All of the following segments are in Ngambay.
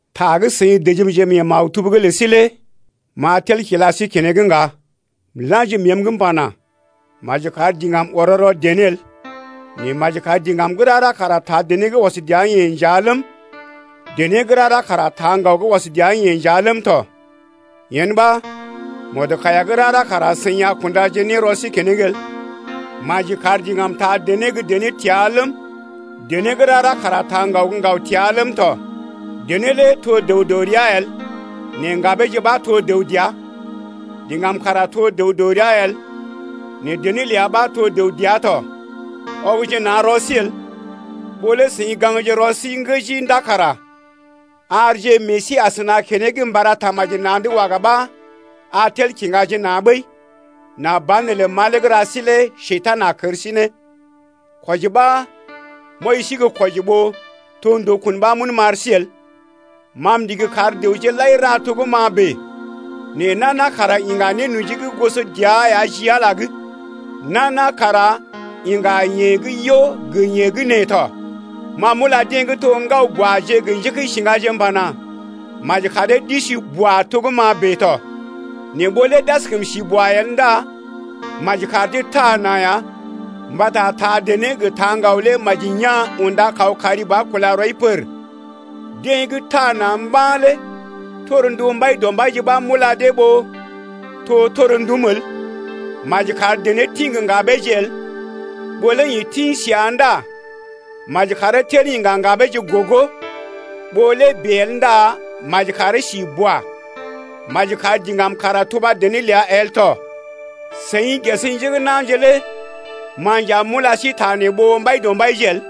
Ta gə́ seḭ dəjimje mee maktub’g lə sí lé m’a tel kila sí keneŋ ŋga. M’la̰ji məəm’g m’pana: Maji kar diŋgam ɔrɔ rɔ dené el. Nɛ maji kar diŋgam gə́ rara kara taa dené gə́ ɔs dəa-yeḛ nja ləm, dené gə́ rara kara taa ŋgaw gə́ ɔs dəa-yeḛ nja ləm tɔ, yen ɓa mɔdkaiya gə́ rara kara seḭ a kundaje ne rɔ sí keneŋ el. Maji kar diŋgam taa dené gə́ dené təa ləm, dené gə́ rara kara taa ŋgaw gə́ ŋgaw təa ləm tɔ. Dené lé to dəw dɔ rəa el nɛ ŋgabeeje ɓa to dəw dəa, diŋgam kara to dəw dɔ rəa el nɛ dené ləa ɓa to dəw dəa tɔ. Ɔgje na̰ rɔ sí el. Ɓó lé seḭ gaŋgje rɔ sí ŋgəji ndá kara arje meḛ sí asəna keneŋ mba ra tamaji na̰’d waga ɓa a tel kiŋgaje na̰ ɓəi nà banelə malee gə́ ra sí lé Njekurai a kər sí ne. Kwɔji ɓa m’wɔji sí gə́ kwɔji ɓó to ndukun ɓa m’un m’ar sí el. Ma m’ndigi kar dəwje lai ra to gə́ ma bèe, nɛ nana kara iŋga nénoji gə́ goso dəa ya ji Ala’g lé. Nana kara iŋga yeḛ gə́ yo gə yeḛ gə́ nee tɔ. Ma m’ula deḛ gə́ to gə́ ŋgaw-buaje gə njékəisiŋgaje m’pana: Maji kar dee d’isi boa to gə́ ma bèe tɔ. Nɛ ɓó lé d’askəm si boa el ndá maji kar dee taa na̰ ya mbata taa dené gə taa ŋgaw lé maji yaa̰ unda kaw kari ba kula rɔi pər. Deḛ gə́ taa na̰ mba̰ lé torndu Mbaidɔmbaije ɓa m’ula dee ɓó to torndum el. Maji kar dené tḭ gə ŋgabeeje el. Ɓó lé yeḛ tḭ səa ndá maji karee tel iŋga ŋgabeeje gogo, ɓó lé bèe el ndá maji karee si boa. Maji kar diŋgam kara tuba dené ləa el tɔ. Seḭ ges njé gə́ na̰je lé ma nja m’ula sí ta nee ɓó Mbaidɔmbaije el.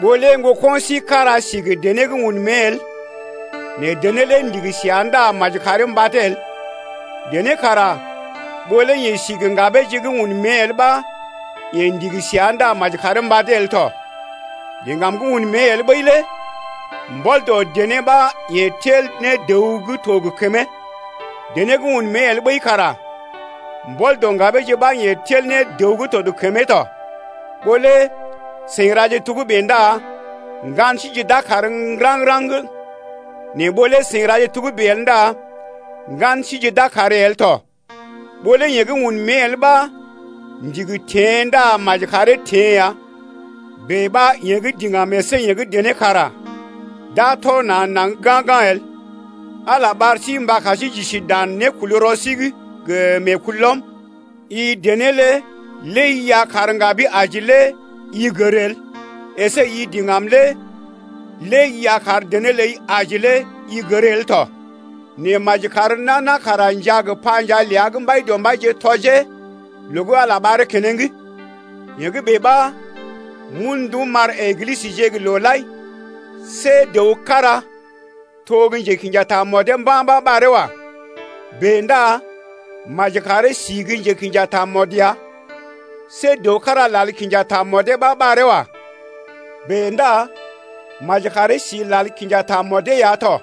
Ɓó lé ŋgoko̰ sí kára si gə dené gə́ un mée el nɛ dené lé ndigi səa ndá maji karee mbadee el. Dené kara ɓó lé yeḛ si gə ŋgabeeje gə́ un mée el ɓa yeḛ ndigi səa ndá maji karee mbadee el tɔ. Diŋgam gə́ un mée el ɓəi lé mbɔl dɔ dené ɓa yeḛ tel ne dəw gə́ to gə kəmee, dené gə́ un mée el ɓəi kara mbɔl dɔ ŋgabeeje ɓa yeḛ tel ne dəw gə́ to gə kəmee to. Ɓó lé seḭ raje togə́bè ndá ŋgan síje d’a kàr raŋg-raŋg nɛ ɓó lé seḭ raje togə́bè el ndá ŋgan síje d’a kàr el tɔ. Ɓó lé yeḛ gə́ un mée el ɓa ndigi teḛ ndá maji karee teḛ ya. Bèe ɓa yeḛ gə́ diŋgam əsé yeḛ gə́ dené kara d’a tɔ na̰ naŋg ga̰-ga̰ el. Ala ɓar sí mba kar sí j’isi dan nékulrɔ sí’g gə meekulɔm. I dené lé lé i a kar ŋgabi aji kara i gər el. Esé i diŋgam lé lé i a kar dené ləi aji kara i gər el tɔ. Nɛ maji kar nana kara njaa gə panjaa ləa gə́ Mbaidɔmbaije tɔjee loo gə́ Ala ɓaree keneŋ. Yee gə́ bèe ɓa m’un ndum m’ar Eglisəje gə́ loo lai. See dəw kára to gə́ njekḭja tamɔdee mba̰ ɓa ɓaree wa. Bèe ndá maji karee si gə njekḭja tamɔd ya. See dəw kára lal kinja tamɔdee ɓa ɓaree wa. Bèe ndá maji karee si lal kinja tamɔdee ya tɔ.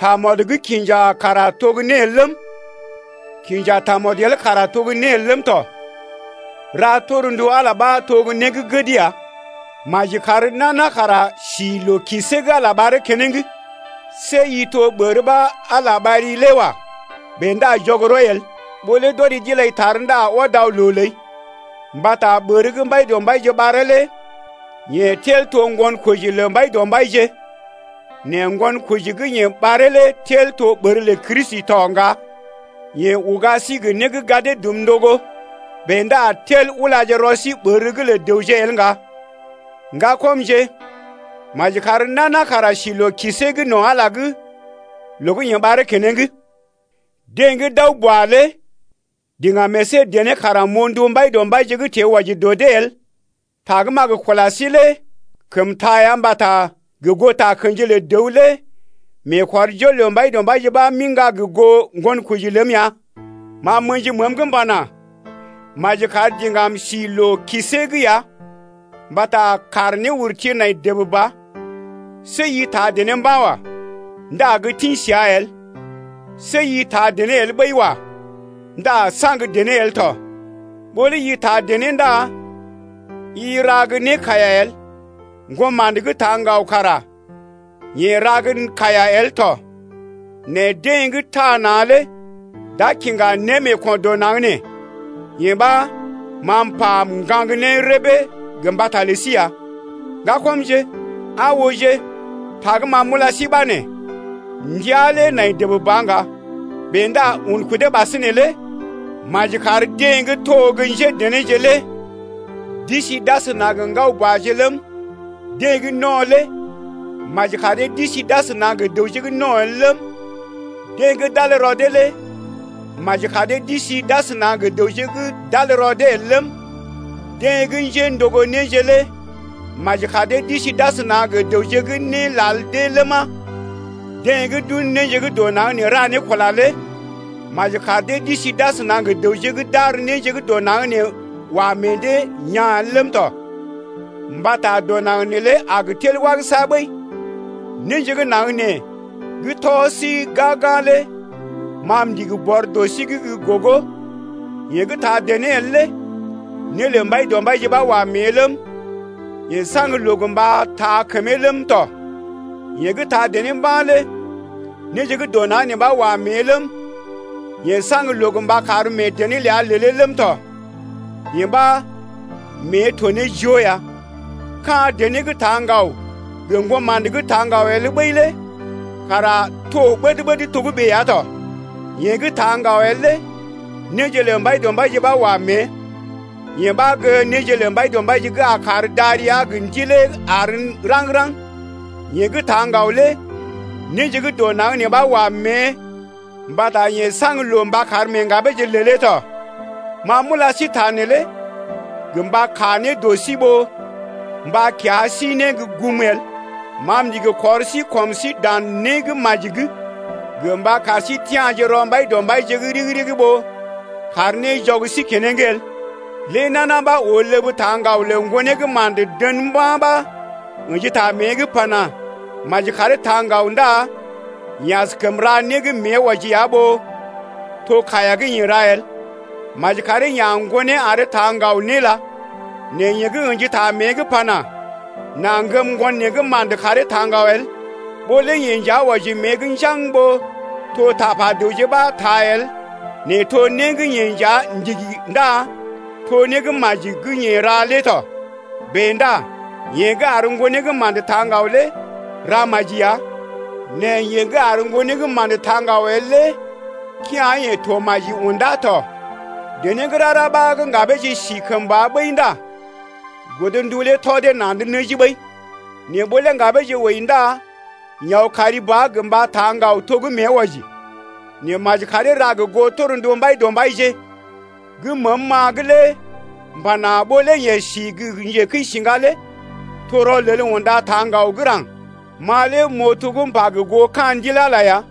Tamɔdə gə́ kinja kara to né el ləm, kinja tamɔd el kara to né el ləm tɔ. Ra torndu Ala ɓa to gə́ né gə́ gəd ya. Maji kar nana kara sí loo-siée gə́ Ala lé ɓaree keneŋ. See i to ɓər ɓa Ala ɓari lé wa. Bèe ndá jɔg rɔi el, ɓó lé d’ɔri d’ilai tar ndá ɔd aw loo ləi. Mbata ɓər gə́ Mbaidɔmbaije ɓaree lé yeḛ tel to ŋgonkoji lə Mbaidɔmbaije, nɛ ŋgonkoji gə́ yeḛ ɓaree lé tel to ɓər lə Kristi tɔ ŋga. Yeḛ uga sí gə né gə́ gadee dum ndogo. Bèe ndá tel ulaje rɔ sí ɓər’g lə dəwje el ŋga. Ŋgakɔmje, maji kar nana kara si loo-siée no̰ Ala’g loo gə́ yeḛ ɓaree keneŋ. Deḛ gə́ d’aw boa lé diŋgam əsé dené kara m’oo ndu Mbaidɔmbaije gə́ teḛ wɔji dɔ dee el. Ta gə́ m’a gə kula sí lé kəm taa ya mbata gə goo takə̰ji lə dəw lé meekɔrjol lə Mbaidɔmbaije ɓa m’iŋga gə goo ŋgonkoji ləm ya. Ma m’ə̰ji məəm’g m’pana: Maji kar diŋgam si loo-siée’g ya mbata kàr néurti nai dəb ba. See i taa dené mba̰ wa. Ndá gə tḭ səa el. See i taa dené el ɓəi wa. Ndá saŋg dené el tɔ. Ɓó lé i taa dené ndá i ra gə́ né kaiya el. Ŋgoma̰də gə́ taa ŋgaw kara yeḛ ra gə́ kaiya el tɔ. Nɛ deḛ gə́ taa na̰ lé d’a kiŋga némeeko̰ dɔ naŋg nee. Yee ɓa, ma m’pa m’gaŋg ne rəbee gə mbata lə sí ya. Ŋgakɔmje, aa ooje, ta gə́ ma m’ula sí ɓa nee: Ndəa lé nai dəb ba ŋga. Bèe ndá un kudee ɓasinè lé maji kar deḛ gə́ to gə́ njédenéje lé d’isi d’asəna gə ŋgaw-buaje ləm, deḛ gə́ no̰ lé maji kar dee d’isi d’asəna gə dəwje gə́ no̰ el ləm, deḛ gə́ d’al rɔ dee lé maji kar dee d’isi d’asəna gə dəwje gə́ d’al rɔ dee el ləm, deḛ gə́ njéndogo néje lé maji kar dee d’isi d’asəna gə dəwje gə́ né lal dee ləma, deḛ gə́ d’un néje gə́ dɔ naŋg ra ne kula lé maji kar dee d’isi d’asəna gə dəwje gə́ d’ar néje gə́ dɔ naŋg nee wa meḛ dee yaa̰ el ləm tɔ. Mbata dɔ naŋg neelé a gə tel wagəsa ɓəi. Néje gə́ naŋg nee gə́ tɔ sí gag-gag lé ma m’ndigi bɔr dɔ sí’g gə́ gogo. Yeḛ gə́ taa dené el lé né lə Mbaidɔmbaije ɓa wa mée ləm, yeḛ saŋg loo gə mba taa kəmee ləm tɔ. Yeḛ gə́ taa dené mba̰ lé néje gə́ dɔ naŋg nee ɓa wa mée ləm, Yeḛ saŋg loo gə mba kar mee dené ləa lelee ləm tɔ. Yee ɓa mée to ne joo ya. Ka̰ dené gə́ taa ŋgaw gə ŋgoma̰də gə́ taa ŋgaw el ɓəi lé kara to ɓəd-ɓəd togə́bè ya tɔ. Yeḛ gə́ taa ŋgaw el lé néje lə Mbaidɔmbaije ɓa wa mée. Yee ɓa gə́ néje lə Mbaidɔmbaije gə́ a kar darəa gə ndilee àr ne raŋg-raŋg ya. Yeḛ gə́ taa ŋgaw lé néje gə́ dɔ naŋg nee ɓa wa mée mbata yeḛ saŋg loo mba kar mee ŋgabeeje lelee tɔ. Ma m’ula sí ta neelé gə mba kaa ne dɔ sí ɓó mba kiya sí ne gum el. Ma m’ndigi kɔr sí kɔm sí dan né gə́ maji’g gə mba kar sí tia̰je rɔ Mbaidɔmbaije’g ɗigi-ɗigi ɓó kar né jɔg sí keneŋ el. Lé nana ɓa oo ləb taa ŋgaw lə ŋgonee gə́ ma̰də dən mba̰ ɓa ə̰ji ta mée’g pana: Maji karee taa ŋgaw ndá yeḛ askəm ra né gə́ mée wɔji ya ɓó to kaiya gə́ yeḛ ra el. Maji karee ya̰ ŋgonee aree taa ŋgaw né ləa. Nɛ yeḛ gə́ ə̰ji ta mée’g pana: N’a ŋgəm ŋgon neḛ gə́ ma̰də karee taa ŋgaw el, ɓó lé yeḛ nja wɔji mée’g njaŋg ɓó to tapa dəwje ɓa taa el nɛ to né gə́ yeḛ nja ndigi ndá to né gə́ maji gə́ yeḛ ra lé tɔ. Bèe ndá yeḛ gə́ ar ŋgonee gə́ ma̰də taa ŋgaw lé ra maji ya, nɛ yeḛ gə́ ar ŋgonee gə́ ma̰də taa ŋgaw el lé kea̰-yeḛ to maji undá tɔ. Dené gə́ rara ɓa gə́ ŋgabeeje si kəmba ɓəi ndá godndu lé tɔ dee na̰’d nəji ɓəi. Nɛ ɓó lé ŋgabeeje wəi ndá yeḛ aw kari ba gə mba taa ŋgaw to gə́ mée wɔji. Nɛ maji karee ra gə goo torndu Mbaidɔmbaije ɓa. Gə́ məəm-ma’g lé m’pana: Ɓó lé yee si gə́ njekəisiŋga lé to rɔlel unda taa ngao gə́ ra̰g. Ma lé m’oo to gə́ m’pa gə goo ka̰ Ndil Ala ya.